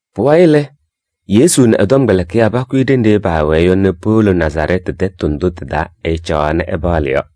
Pʋwayɩ lɛ, Yesu nɛ ɛ-tɔmkpɛlɩkɩyaa pakʋyɩ ɖenɖe paawɛɛ yɔ nɛ powolo Nazarɛɛtɩ tɛtʋ ndʋ tɩ-taa ɛcaɣaɣ nɛ ɛpaɣlɩ yɔ.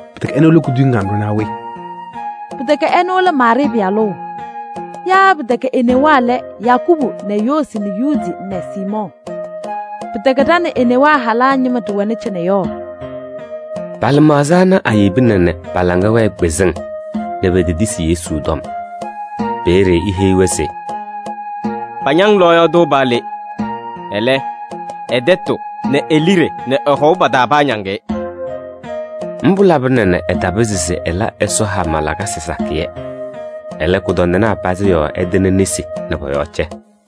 Pɩtɛkɛ ɛnʋ lɛ kuduyiŋ kanɖʋ naa we? Pɩtɛkɛ ɛnʋ lɛ Maarɩɩ pɩyalʋ? Yaa pɩtɛkɛ e-newaa lɛ Yakubu nɛ Yoosi nɛ Yuudi nɛ Siimɔɔ? Pɩtɛkɛ ɖa nɛ e-newaa halaa ñɩma ɖɩwɛnɩ cɩnɛ yɔ?” Pa-lɩmaɣza ana ayebina nɛ pa-laŋa wɛɛ kpɩzɩŋ nɛ petetisi Yesu tɔm. Peeye eheyi-wɛ se: “Pañaŋ lɔɔyaɣ tʋ paa le. Ɛlɛ, ɛ-tɛtʋ nɛ e-liɖe nɛ ɛ-hɔʋ pa-taa paañaŋ-ɩ.” Mbʋ labɩna nɛ ɛtapɩzɩ se ɛla Ɛsɔ hama lakasɩ sakɩyɛ. Ɛlɛ, kʋdɔndɩnaa pazɩ yɔɔ ɛtɩnɩ nesi nɛ pɔ-yɔɔ cɛ.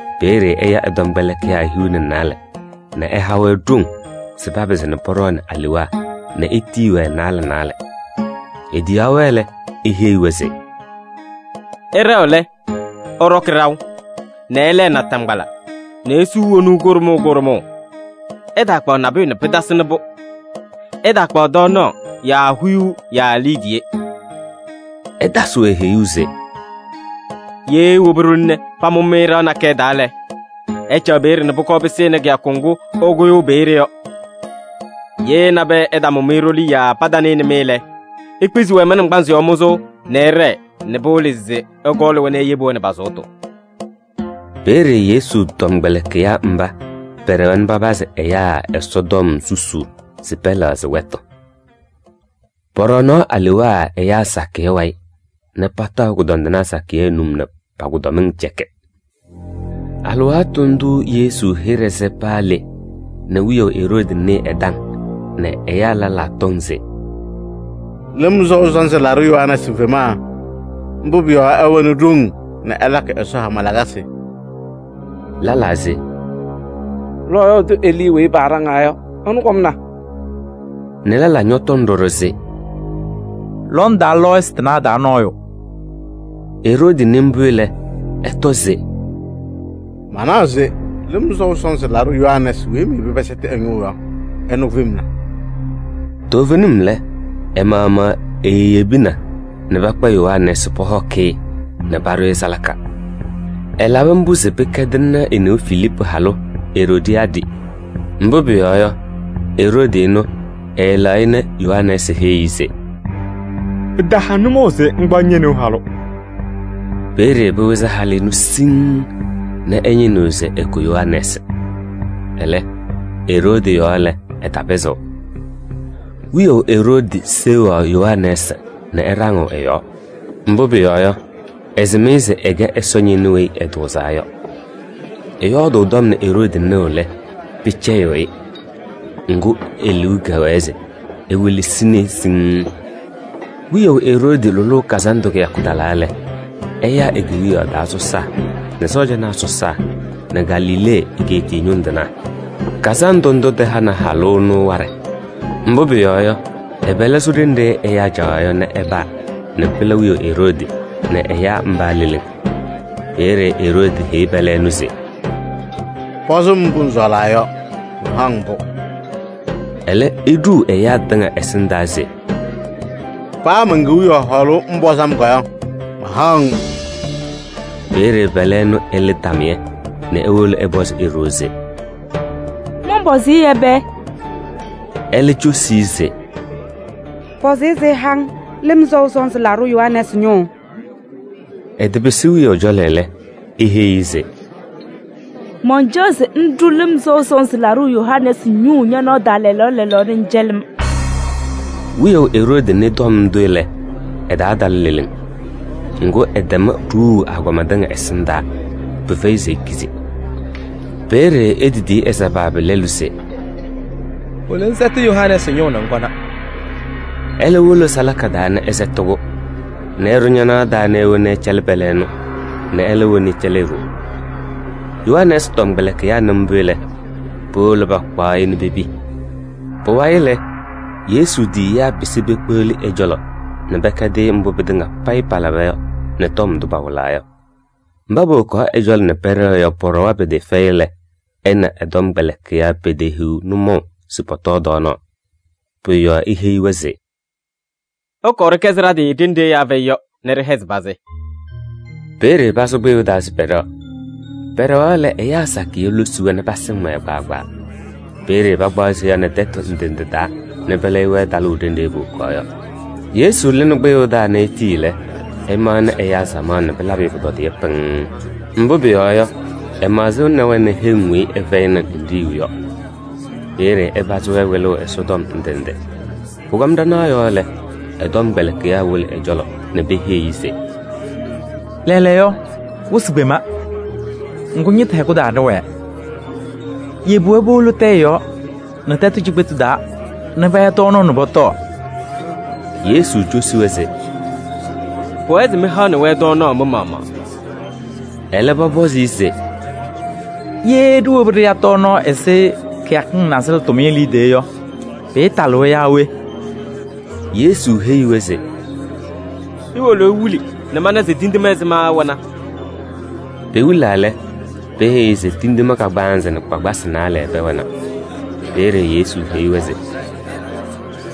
Peeye ɛya ɛ-tɔmkpɛlɩkɩyaa hiu nɛ naalɛ nɛ ɛha-wɛ ɖoŋ se papɩzɩ pɔɖɔɔnɩ alewaa nɛ etiyi-wɛ naalɛ naalɛ. Etiyaɣ-wɛ lɛ, eheyi-wɛ se: “Ɩɖɛɣ lɛ, ɩɖɔkɩ ɖaʋ nɛ ɩlɛɛ naataŋgbala nɛ isuu wonuu kʋɖʋmʋʋ kʋɖʋmʋʋ. Ɩtaakpaɣ nabʋyʋ nɛ pɩtasɩnɩ-pʋ. Ɩtaakpaɣ tɔɔnaɣ yaa huyuu yaa liidiye.” Ɛtasɩ-wɛ heyuu se: “Ye iwobi ɖoli nɛ pamʋ-mɩ ɖɩɣa nakɛyɛ taa lɛ, ɩcaɣ peeye nɛ pʋkɔɔ pɩsɩnɩ kɩyakʋ ŋgʋ ɩkʋyʋʋ peeye yɔ. Ye nabɛyɛ ɛtamʋ-mɩ ɖoli yaa patanɩnɩ-mɩ lɛ, ikpizi-wɛ mɩ-naŋgbanzɩ yɔɔ mʋzʋʋ nɛ ɩɖɛɛ nɛ pɩwɩlɩ se ɩkɔɔlɩ-wɛ nɛ iyebi-wɛ nɛ pa-sʋʋtʋ.” Peeye Yesu tɔmkpɛlɩkɩyaa mba pɛɖɛwa nɛ papazɩ ɛyaa Ɛsɔtɔm susuu se pɛlɛɣzɩ wɛtʋ. Pɔɖɔɔnaɣ alewaa ɛyaa sakɩyɛ wayɩ nɛ pataɣ kʋdɔndɩnaa sakɩyɛ num nɛ pa-kʋdɔmɩŋ cɛkɩ. Alɩwaatʋ ndʋʋ Yesu hɩɖɛ sɛ paa le nɛ wiyaʋ Eroodi nɩɩ ɛ-taŋ nɛ ɛyaa lɛlaa tɔŋ se: “Lɩm Sɔʋ Sɔnzɩ Laɖʋ Yohanɛɛsɩ femna. Mbʋ pʋyɔɔ yɔ, ɛwɛnɩ ɖoŋ nɛ ɛlakɩ Ɛsɔ hama lakasɩ.” Lɛlaa se: “Lɔɔyaɣ tʋ Elii weyi paaɖaŋaa yɔ, ɛnʋ kɔmna” nɛ lɛlaa ñɔtɔŋ ɖɔɖɔ se: “Lɔndaa lɔɔyɩsɩ tɩnaa taa nɔɔyʋ.” Eroodi nɩ mbʋ lɛ, ɛtɔ se: “Manaɣ se Lɩm Sɔʋ Sɔnzɩ Laɖʋ Yohanɛɛsɩ weyi meyebi pɛsɛtɩ ɛ-ñʋʋ yɔ, ɛnʋ femna.” Toovenim lɛ, ɛ-maɣmaɣ eeyebina nɛ pakpa Yohanɛɛsɩ pɔhɔkɩ-ɩ nɛ paɖʋ salaka. Ɛlabɩ mbʋ se pɩkɛdɩnɩ e-neu Filiipu halʋ Eroodiyaadɩ. Mbʋ pʋyɔɔ yɔ, Eroodi ɛnʋ ɛɛlɛɣ-ɩ nɛ Yohanɛɛsɩ heyi-i se: “Pɩtaha nʋmɔʋ se ŋkpaɣ ñe-neu halʋ.” Peeye pɩwɩzɩ halʋ ɛnʋ siŋŋ nɛ ɛñɩnɩɣ se ɛkʋ Yohanɛɛsɩ. Ɛlɛ, Eroodi yɔɔ lɛ, ɛtapɩzɩɣ. Wiyaʋ Eroodi seɣaɣ Yohanɛɛsɩ nɛ ɛɖaŋɩɣ ɛ-yɔɔ. Mbʋ pʋyɔɔ yɔ, ɛsɩm-ɩ se ɛkɛ Ɛsɔ ñɩnʋ weyi ɛtʋʋzaa yɔ. Ɛyɔɔdʋʋ tɔm nɛ Eroodi nɩɣ lɛ, pɩcɛyɩɣ-ɩ. Ŋgʋ, e-liu kɛwɛɛ se ewelesini-i siŋŋ. Wiyaʋ Eroodi lʋlʋʋ kazandʋ kɩyakʋ talaa lɛ, ɛyaa e-kewiyaɣ taa sɔsaa nɛ sɔɔjanaa sɔsaa nɛ Galilee egeetiye ñʋŋ tɩnaa. Kazandʋ ndʋ tɩhanɩ halʋ ɛnʋ waɖɛ. Mbʋ pʋyɔɔ yɔ, ɛ-pɛlɛ sʋ ɖenɖe ɛyaa caɣaɣ yɔ nɛ ɛpaa nɛ pɩla wiyaʋ Eroodi nɛ ɛyaa mba leleŋ. Peeye Eroodi heyi pɛlɛ ɛnʋ se: “Pɔzɩ-m mbʋ ŋsɔɔlaa yɔ, mahaɣ-ŋ-pʋ.” Ɛlɛ, eɖuu ɛyaa tɩŋa ɛsɩndaa se: “Paa men-kewiyaɣ hɔɔlʋʋ ŋpɔzɩ-m yɔ, mahaɣ-ŋ.” Peeye pɛlɛ ɛnʋ ɛlɩ tamɩyɛ nɛ ewolo ɛpɔzɩ e-ɖoo se: “Mɔnpɔzɩ-ɩ ɛbɛ?” Ɛlɛ cosi-i se: “Pɔzɩ-ɩ se ɛha-ŋ Lɩm Sɔʋ Sɔnzɩ Laɖʋ Yohanɛɛsɩ ñʋʋ.” Ɛtɩpɩsɩ wiyaʋ cɔlɔ lɛ, eheyi-i se: “Mancaɣ se ŋɖʋ Lɩm Sɔʋ Sɔnzɩ Laɖʋ Yohanɛɛsɩ ñʋʋ ñanaɣ taa lɛɛlɛɛyɔ nɛ ŋcɛlɩ-m.” Wiyaʋ Eroodi nɩ tɔm ndʋ lɛ, ɛ-taa tala leleŋ. Ŋgʋ, ɛtɛm ɖuuu agɔma tɩŋa ɛsɩndaa. Pɩfɛyɩ se ekizi. Peeye etitiyi ɛ-sabaabi lɛlʋ se: “Wolo ŋsɛtɩ Yohanɛɛsɩ ñʋʋ nɛ ŋkɔna.” Ɛlɛ wolo salaka taa nɛ ɛsɛtɩ-kʋ nɛ ɛɖʋ ñanaɣ taa nɛ ewoni ɛcɛlɩ pɛlɛ ɛnʋ nɛ ɛlɛ woni ɛcɛlɩ e-ɖoo. Yohanɛɛsɩ tɔmkpɛlɩkɩyaa nɩ mbʋ lɛ, powolo pakpaɣ-ɩ nɛ pepi. Pʋwayɩ lɛ, Yesu tiyiyaa pɩsɩ pekpeɣli ɛ-cɔlɔ nɛ pɛkɛdɩ-ɩ mbʋ pɩtɩŋa payɩ palaba yɔ nɛ tɔm ndʋ pawɩlaa yɔ. Mba powokaɣ ɛ-cɔlɔ nɛ pɛɖɛɣ yɔ, pɔɖɔwa pɩtɩɩfɛyɩ lɛ, ɛ nɛ ɛ-tɔmkpɛlɩkɩyaa petehiɣ nʋmɔʋ se pɔtɔɔ tɔɔnaɣ. Pʋ-yɔɔ eheyi-wɛ se: “Ɩkɔɔ ɖɩkɛzɩ ɖa-tɩ ɖenɖe ɛyaa fɛyɩ yɔ nɛ ɖɩhɛzɩ pazɩ.” Peeye pasʋ kpɩyʋʋ taa se pɛɖɛɣ. Pɛɖɛɣaɣ lɛ, ɛyaa sakɩyɛ losi-wɛ nɛ pasɩm-wɛ kpaagbaa. Peeye pakpaɣ seya nɛ tɛtʋ ndɩ ndɩ taa nɛ pɛlɛyɩ-wɛ talʋʋ ɖenɖe powokaɣ yɔ. Yesu lɩnɩ kpɩyʋʋ taa nɛ etii lɛ, ɛmaɣnɩ ɛyaa samaɣ nɛ pɩlabɩ-ɩ pʋtɔdɩyɛ pɩŋŋ. Mbʋ pʋyɔɔ yɔ, ɛmaɣzɩnɩ-wɛ nɛ heŋ weyi ɩfɛyɩnɩ ninɖiɣyu yɔ. Peeye ɛpazɩ-wɛ wɩlʋʋ Ɛsɔtɔm ndɩ ndɩ. Pʋkɔm ɖanaɣ yɔɔ lɛ, ɛ-tɔmkpɛlɩkɩyaa wolo ɛ-cɔlɔ nɛ peheyi-i se: “Lɛɛlɛɛyɔ wɩsɩ kpema, ŋgʋ ñɩtʋ hɛkʋ taa ɖɩwɛɛ. Yebi-wɛ powolo tɛyɛ yɔɔ nɛ tɛtʋ cikpetu taa nɛ paya tɔɔnaɣ nɛ pɔtɔɔ.” Yesu cosi-wɛ se: “Pʋwɛɛ se mɩhaɣnɩ-wɛ tɔɔnaɣ mɩ-maɣmaɣ.” Ɛlɛ, pɔpɔzɩ-ɩ se: “Ye ɖiwobi ɖɩya tɔɔnaɣ ɛzɩ kɩyakɩŋ nasɩlɛ tʋmɩyɛ liidiye yɔ, pɩɩtalɩ-wɛ yaa we?” Yesu heyi-wɛ se: “Iwolo iwili nɛ mana se tindine ɛzɩma ɩwɛna.” Pewilaa lɛ, peheyi-i se tindine kagbaanzɩ nɛ kpakpasɩ naalɛ pɛwɛna. Peeye Yesu heyi-wɛ se: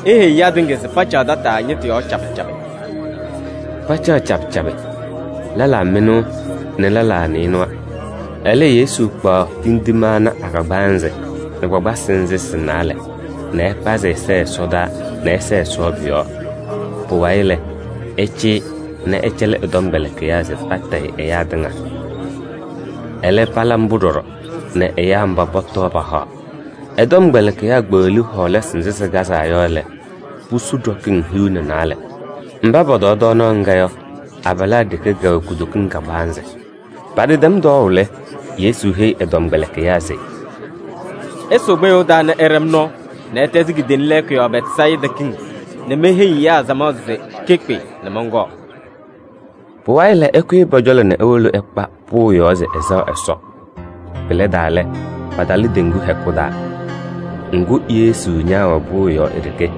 “Iheyi ɛyaa tɩŋa se pacaɣ tataa ñɩtʋ yɔɔ cabɩ cabɩ.” Pacaɣ cabɩ cabɩ, lɛlaa mɩnʋʋ nɛ lɛlaa nɩɩnʋwa. Ɛlɛ, Yesu kpaɣ tindine ana a-kagbaanzɩ nɛ kpakpasɩ nzɩ sɩ-naalɛ nɛ ɛkpazɩ ɛza ɛsɔdaa nɛ ɛsɛɛ Ɛsɔ pʋ-yɔɔ. Pʋwayɩ lɛ, ɛcɩyɩ nɛ ɛcɛlɩ ɛ-tɔmkpɛlɩkɩyaa se patayɩ ɛyaa tɩŋa. Ɛlɛ, pala mbʋ ɖɔɖɔ nɛ ɛyaa mba pɔtɔɔ pahaɣ. Ɛ-tɔmkpɛlɩkɩyaa kpeɣli hɔɔlasɩ nzɩ sɩkazaa yɔ lɛ, pusu ɖɔkɩŋ hiu nɛ naalɛ. Mba pɔtɔɔ tɔɔnaɣ ŋga yɔ, abalaa ɖeke kɛwɛ kutokiŋ kagbaanzɩ. Patɩtɛm tɔɔʋ lɛ, Yesu heyi ɛ-tɔmkpɛlɩkɩyaa se: “Ɩsʋʋ kpɩyʋʋ taa nɛ ɩɖɛ-m nɔɔ nɛ ɩtɛzɩ kidiiliŋ lɛɛkʋ yɔɔ Bɛtsayɩda kiŋ nɛ meheyi ɛyaa samaɣ se kekpe nɛ mɔnkɔɔ.” Pʋwayɩ lɛ, ɛkʋyɩ pɔ-cɔlɔ nɛ ewolo ɛkpa pʋʋ yɔɔ se ɛsɛɣ Ɛsɔ. Pɩlɛdaa lɛ, patalɩ teŋgu hɛkʋ taa. Ŋgʋ, Yesu ñaawɛ pʋʋ yɔɔ e-ɖeke.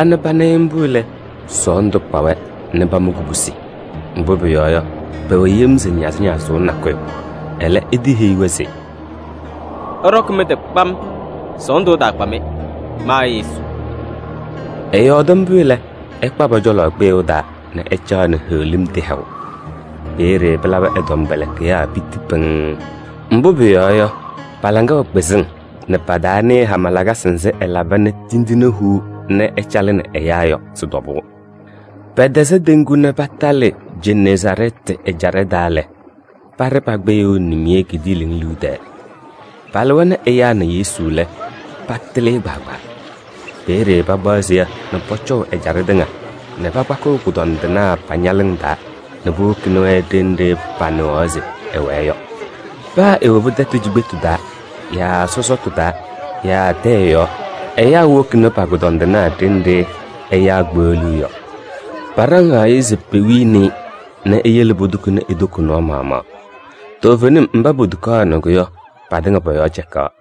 nɛ pana-ɩ mbʋ lɛ, sɔɔndʋ kpa-wɛ nɛ pama kubusi. Mbʋ pʋyɔɔ yɔ, pɛwɛ yem se ñazɩñazʋʋ nakʋyʋ. Ɛlɛ, etiheyi-wɛ se: “Ɩɖɔkɩ mɩ-tɩ kpam, sɔɔndʋ ɛtaakpa-mɩ, ma Yesu.” Ɛyɔɔdɩ mbʋ lɛ, ɛkpa pɔ-cɔlɔ kpɩyʋʋ taa nɛ ɛcaɣ nɛ heɣlim tɩhɛʋ. Peeye pɩlabɩ ɛ-tɔmkpɛlɩkɩyaa piti pɩŋŋ. Mbʋ pʋyɔɔ yɔ, pa-laŋa wɛ kpɩzɩŋ nɛ pataanɩɩ hama lakasɩ nzɩ ɛlaba nɛ tindine huu nɛ ɛcalɩnɩ ɛyaa yɔ sɩ-tɔbʋʋ. Pɛtɛzɩ teŋgu nɛ patalɩ Jeneezaarɛɛtɩ ɛjaɖɛ taa lɛ, paɖɩ pa-kpɩyʋʋ nimiye kidiiliŋ liu tɛɛ. Palɩwa nɛ ɛyaa na Yesu lɛ, patɩlɩ-ɩ kpaagbaa. Peeye pakpaɣ seya nɛ pɔcɔʋ ɛjaɖɛ tɩŋa nɛ pakpakɩɣ kʋdɔndɩnaa pa-ñalɩŋ taa nɛ powokini-wɛ ɖenɖe panɩɣaɣ se ɛwɛɛ yɔ. Paa ewobi tɛtʋ cikpetu taa yaa sɔsɔtʋ taa yaa tɛyɛ yɔɔ yɔ, ɛyaa wokini pa-kʋdɔndɩnaa ɖenɖe ɛyaa kpeɣliɣ yɔ. Paɖaŋaɣ-ɩ se pewini-i nɛ eyele potukuni e-toko nɔɔ maɣmaɣ. Toovenim mba potukaɣnɩ-kʋ yɔ, patɩŋa pɔ-yɔɔ cɛkaɣ.